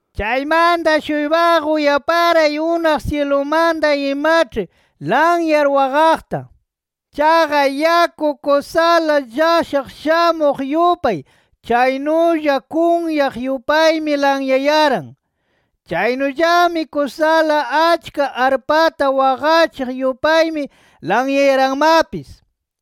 Chaymanta-shuypaqa uyaparay unaq syilumanta imaĉhi lanyar waqaqta. Chaqa yaku kusala llashaq shamuq yupay chaynulla kunyaq yupaymi lanyayaran. Chaynullami kusala achka arpata waqachiq yupaymi lanyayaranmapis.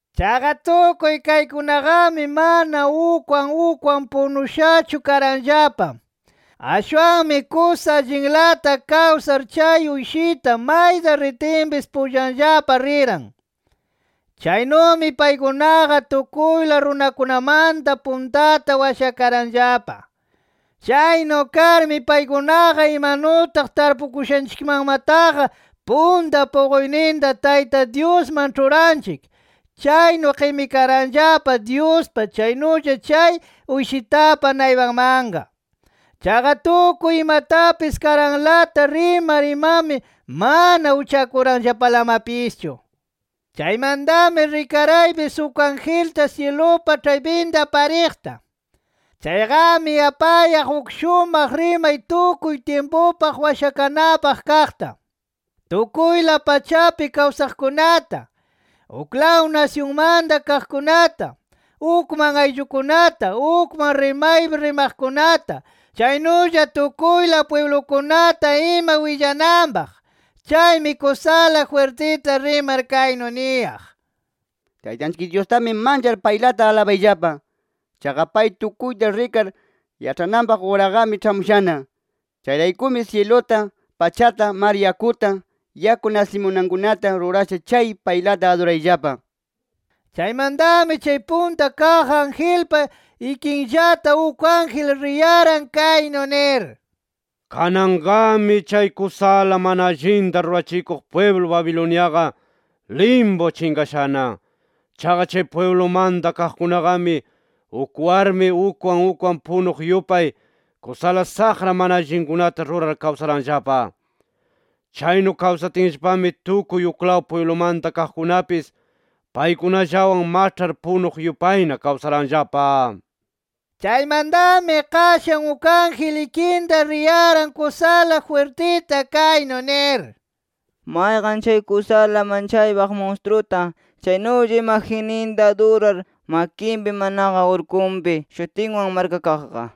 Chaqa tukuy kaykunaqami mana ukwan ukwan punushachu karanllapa. Ashwanmi kusa allinlata kawsar chay Uyshita mayta ritinpis pullanllapa riran. Chaynumi paykunaqa tukuyla runakunamanta puntata washakaranllapa. Chaynu karmi paykunaqa imanutaq tarpukushanchikmanmataqa punta puquyninta Tayta Dyusman ĉhuranchik, chaynu qimikaranllapa Dyuspa chaynulla chay Uyshitapa naypanmanqa. Chaqa tukuy imatapis karanlata rimar imami mana uchakuranllapalamapischu. Chaymantami rikaraypis uk angelta syilupa ĉhaypinta pariqta. Chayqami apayaq uk shumaq rimay tukuy tyimpupaq washakanapaq kaqta, tukuyla pachapi kawsaqkunata, uklaw nasyunmanta kaqkunata, ukman ayllukunata, ukman rimaypi rimaqkunata, chaynulla tukuyla pwiblukunata ima willananpaq. Chaymi kusala jwirtita rimar kaynu niyaq: “Taytanchik Dyustami manchar, paylata alabayllapa. Chaqa pay tukuyta rikar, yaĉhananpaq uraqami ĉhamushana. Chayraykumi syiluta, pachata, mar yakuta, yaku nasimunankunata rurasha chay paylata adurayllapa” nir. Chaymantami chay punta kaq angelpa ikinllata uk ángel riyaran kaynu nir: “¡Kananqami chay kusala mana allinta rurachikuq pwiblu Babiloniaqa limpu chinqashana! Chaqa chay pwiblumanta kaqkunaqami, uk warmi ukwan ukwan punuq yupay kusala saqra mana allinkunata rurar kawsaranllapa. Chaynu kawsatinllapami tukuy uklaw pwiblumanta kaqkunapis paykunallawan maĉhar punuq yupayna kawsaranllapa” nir. Chaymantami qashan uk ángel ikinta riyaran kusala jwirtita kaynu nir: “Mayqan chay kusala manchaypaq munstruta, chaynulla imagenninta adurar makinpi manaqa urkunpi shutinwan markakaqqa,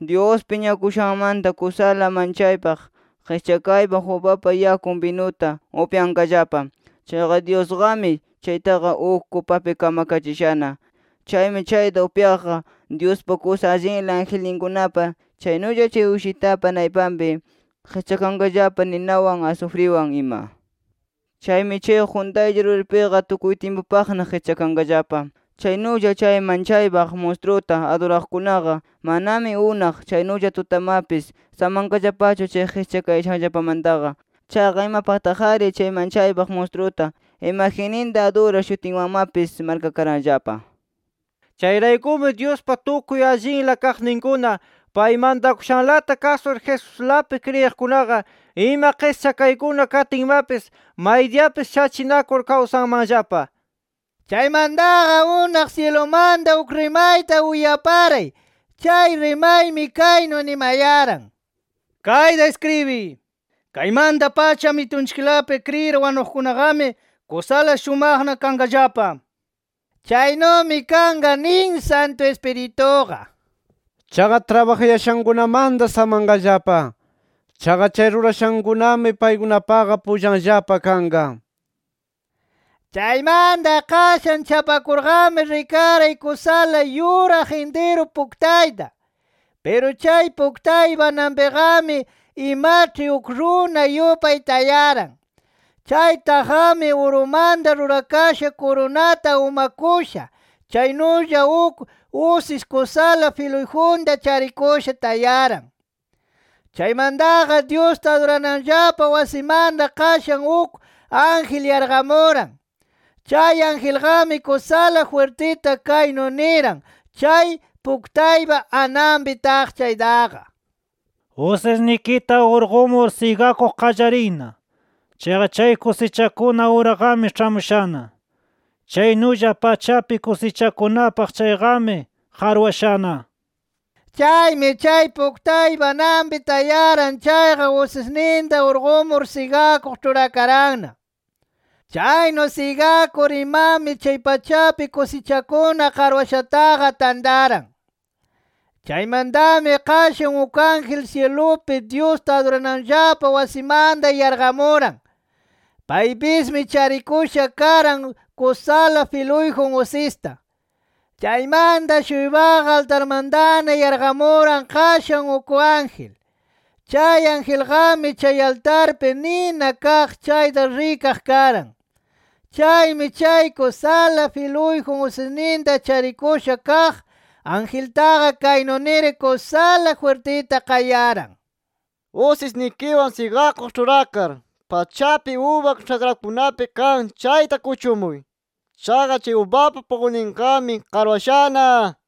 Dyus piñakushanmanta kusala manchaypaq qischakaypaq ubapa yakun binuta upyanqallapa. Chaqa Dyusqami chaytaqa, uk kupapi kamkachishana. Chaymi chayta upyaqqa, Dyuspa kusa allinla angelninkunapa, chaynulla chay Uyshitapa naypanpi, qischakanqallapa ninawan asufriwan ima. Chaymi chay quntaylla ruripiqa tukuy tyimpupaqna qischakanqallapa. Chaynulla, chay manchaypaq munstruta aduraqkunaqa, manami unaq chaynulla tutamapis samanqallapachu chay qischakayashanllapamantaqa. Chaqa imapaqtaq-ari chay manchaypaq munstruta, imagenninta adurar shutinwanmapis markakaranllapa”. ¡Chayraykumi Dyuspa tukuy allinla kaqninkuna, pay mantakushanlata kasur Jesuslapi kriyiqkunaqa, ima qischakaykuna katinmapis maydiyapis shachinakur kawsanmanllapa! Chaymantaqa unaq syilumanta uk rimayta uyaparay. Chay rimaymi kaynu nimayaran: “Kayta iskribiy: Kaymanta-pacha, Amitunchiklapi kriyir wanuqkunaqami, kusala shumaqna kanqallapa” nir. “Chaynumi kanqa” nin Santu Ispirituqa. “Chaqa trabajayashankunamanta samanqallapa. Chaqa chay rurashankunami, paykunapaqa pullanllapa kanqa” nir. Chaymanta qashan chapakurqami rikaray kusala yuraq intiru puktayta. Piru chay puktaypa ananpiqami imaĉhi uk runa yupay tayaran. Chay taqqami, urumanta rurakasha kurunata umakusha, chaynulla uk usis kusala filuyjunta charikusha tayaran. Chaymantaqa, Dyusta adurananllapa wasimanta qashan uk ángel yarqamuran. Chay angelqami kusala jwirtita kaynu niran chay puktaypa ananpi taq chaytaqa: “¡Usisnikita urqumur sigakuq qallariyna! ¡Chaqa chay kusichakuna uraqami ĉhamushana! ¡Chaynulla pachapi kusichakunapaq chayqami qarwashana!” nir. Chaymi chay puktaypa ananpi tayaran chayqa, usisninta urqumur sigakuq ĉhurakaranna. Chaynu sigakur imami chay pachapi kusichakuna qarwashataqa tantaran. Chaymantami qashan uk ángel syilupi Dyusta adurananllapa wasimanta yarqamuran. Paypismi charikusha karan, kusala filuyjun usista. Chaymanta-shuypaqa altarmantana yarqamuran qashan uk ángel. Chay angelqami chay altarpi nina kaq chayta rikaq karan. Chaymi chay kusala filuyjun usisninta charikusha kaq angeltaqa kaynu nir kusala jwirtita qayaran: “¡Usisnikiwan sigakuq ĉhurakar, pachapi uba ĉhakrakunapi kan chayta kuchumuy! ¡Chaqa chay ubapa puquyninqami qarwashana!” nir.